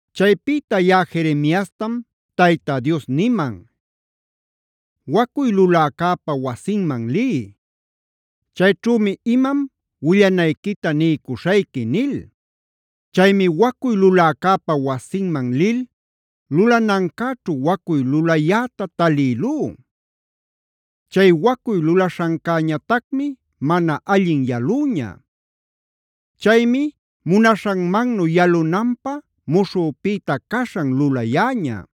Chaypïta yaꞌa Jeremiastam Tayta Dios niman: “Wacuy luläcäpa wasinman liy. Chayćhümi imam willanayquita niycuśhayqui” nil. Chaymi wacuy luläcäpa wasinman lil lulanancäćhu wacuy lulayäta talïlú. Chay wacuy lulaśhancäñatacmi mana allin yalüña. Chaymi munaśhanmannu yalunanpä muśhüpïta caśhan lulayäña.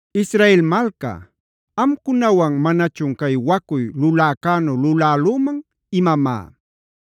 “Israel malca, ¿amcunawan manachun cay wacuy luläcänu lulälüman imamá?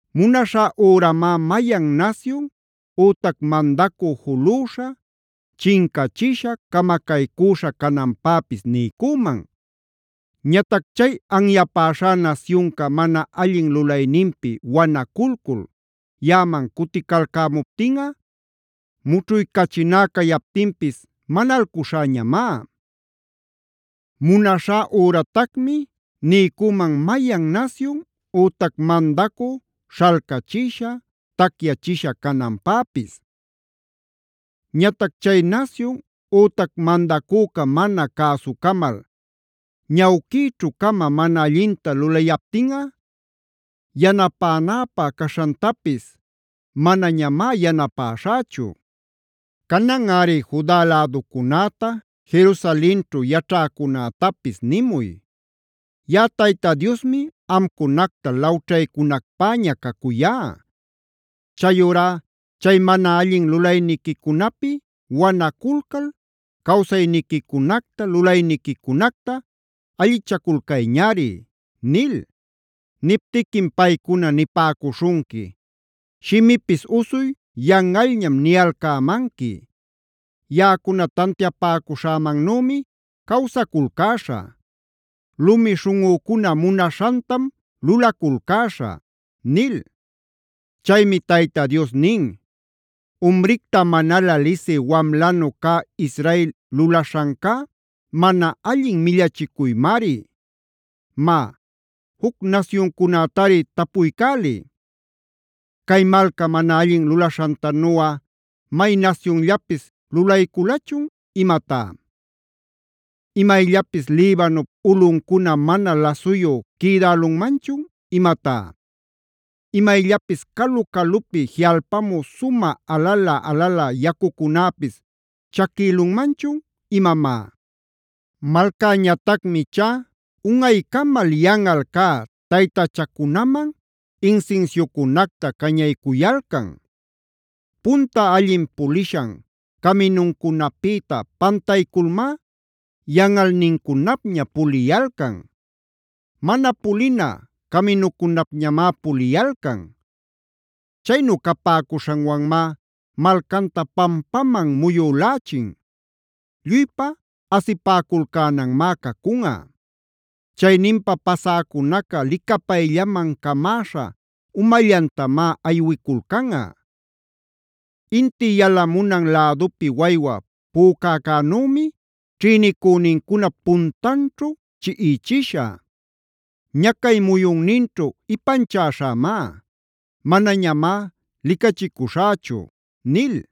Munaśhá üramá mayan nasyun ütac mandacü juluśha, chincachisha, camacaycüśha cananpäpis niycüman. Ñatac chay anyapäśhá nasyunca mana allin lulayninpi wanaculcul yaꞌaman cuticalcämuptinꞌa mućhuycachiná cayaptinpis manalcuśhäñamá. Munaśhá üratacmi niycüman mayan nasyun ütac mandacü śhalcachisha, tacyachisha cananpäpis. Ñatac chay nasyun ütac mandacüca mana cäsucamal ñawquïćhu-cama mana allinta lulayaptinꞌa, yanapänäpä caśhantapis manañamá yanapäśhächu. “Cananꞌari Juda läducunäta, Jerusalenćhu yaćhäcunätapis nimuy: ‘Yaꞌa Tayta Diosmi amcunacta lawćhaycunacpäña cacuyá. Chayurá chay mana allin lulayniquicunapi wanaculcal cawsayniquicunacta, lulayniquicunacta allichaculcayñari’ nil. Niptiquim paycuna nipäcuśhunqui: ‘Shimipis usuy yanꞌalñam niyalcämanqui. Yaꞌacuna tantiapäcuśhämannümi cawsaculcäśhä. Lumi śhunꞌücuna munaśhantam lulaculcäśhä’” nil. Chaymi Tayta Dios nin: “Umricta manalä lisï wamlanu cä Israel lulaśhancá mana allin millachicuymari. Má, juc nasyuncunätari tapuycäliy: ¿Cay malca mana allin lulaśhantanuꞌa may nasyunllapis lulayculachun imatá? ¿Imayllapis Libanup ulꞌuncuna mana lasuyub quïdälunmanchun imatá? ¿Imayllapis calu-calupi jiꞌalpamü sumä alalä-alalä yacucunäpis chaquïlunmanchun imamá? Malcäñatacmi ichá unꞌaycamal yanꞌal cä taytachacunaman insinsiucunacta cañaycuyalcan. Punta allin pulishan caminuncunapïta pantayculmá yanꞌalnincunapña puliyalcan; mana pulina caminucunapñamá puliyalcan. Chaynu capäcuśhanwanmá malcanta pampaman muyülächin; lluypa asipäculcänanmá cacunꞌa. Chayninpa pasäcunaca licapayllaman camäśha umallantamá aywiculcanꞌa. Inti yalamunan lädupi waywa pücäcänümi ćhïnicünincunap puntanćhu chiꞌichishä. Ñacay muyunninćhu ipanchäśhämá; manañamá licachicuśhächu” nil.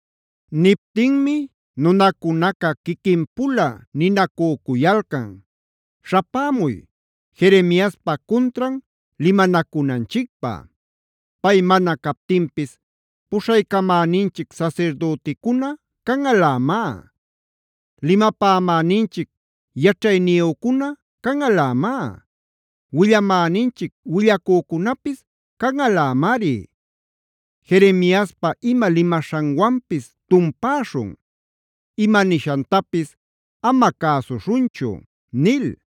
Niptinmi nunacunaca quiquin-pula ninacücuyalcan: “Śhapämuy, Jeremiaspa cuntran limanacunanchicpä. Pay mana captinpis puśhaycamäninchic sasirdüticuna canꞌalämá; limapämäninchic yaćhayniyücuna canꞌalämá; willamäninchic willacücunapis canꞌalämari. Jeremiaspa ima limaśhanwanpis tumpäśhun; ima nishantapis ama cäsuśhunchu” nil.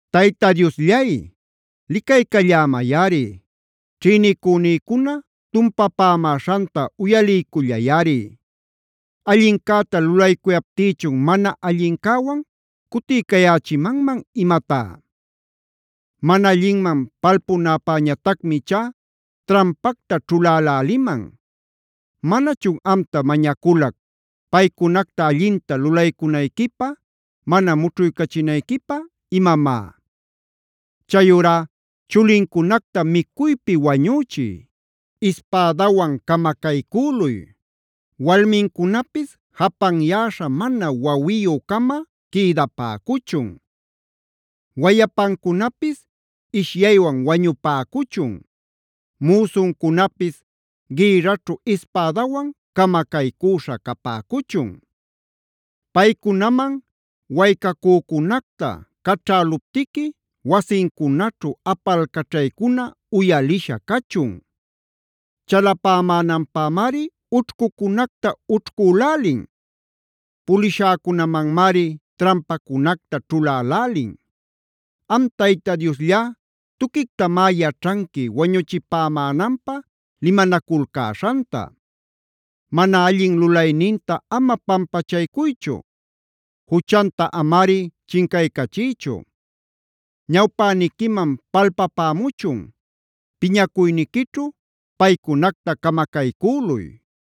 Tayta Diosllay, licaycallämayꞌari; ćhïnicünïcuna tumpapämäśhanta uyaliycullayꞌari. ¿Allincäta lulaycuyaptïchun mana allincäwan cutiycayächimanman imatá? Mana allinman palpunäpäñatacmi ichá trampacta ćhuläläliman. ¿Manachun amta mañaculac paycunacta allinta lulaycunayquipä, mana mućhuchinayquipä imamá? Chayurá chulincunacta micuypi wañüchiy; ispädawan camacaycüluy. Walmincunapis japanyäśha mana wawiyü-cama quïdapäcuchun. Wayapancunapis ishyaywan wañupäcuchun; müsuncunapis gïrraćhu ispädawan camacaycüśha capäcuchun. Paycunaman waycacücunacta caćhäluptiqui wasincunaćhu apalcaćhaycuna uyalisha cachun. Chalapämänanpämari ućhcucunacta ućhcülälin; pulishäcunamanmari trampacunacta ćhulälälin. Am Tayta Diosllá tuquictamá yaćhanqui wañuchipämänanpä limanaculcäśhanta. Mana allin lulayninta ama pampachaycuychu; juchanta amari chincaycachiychu. Ñawpäniquiman palpapämuchun; piñacuyniquićhu paycunacta camacaycüluy.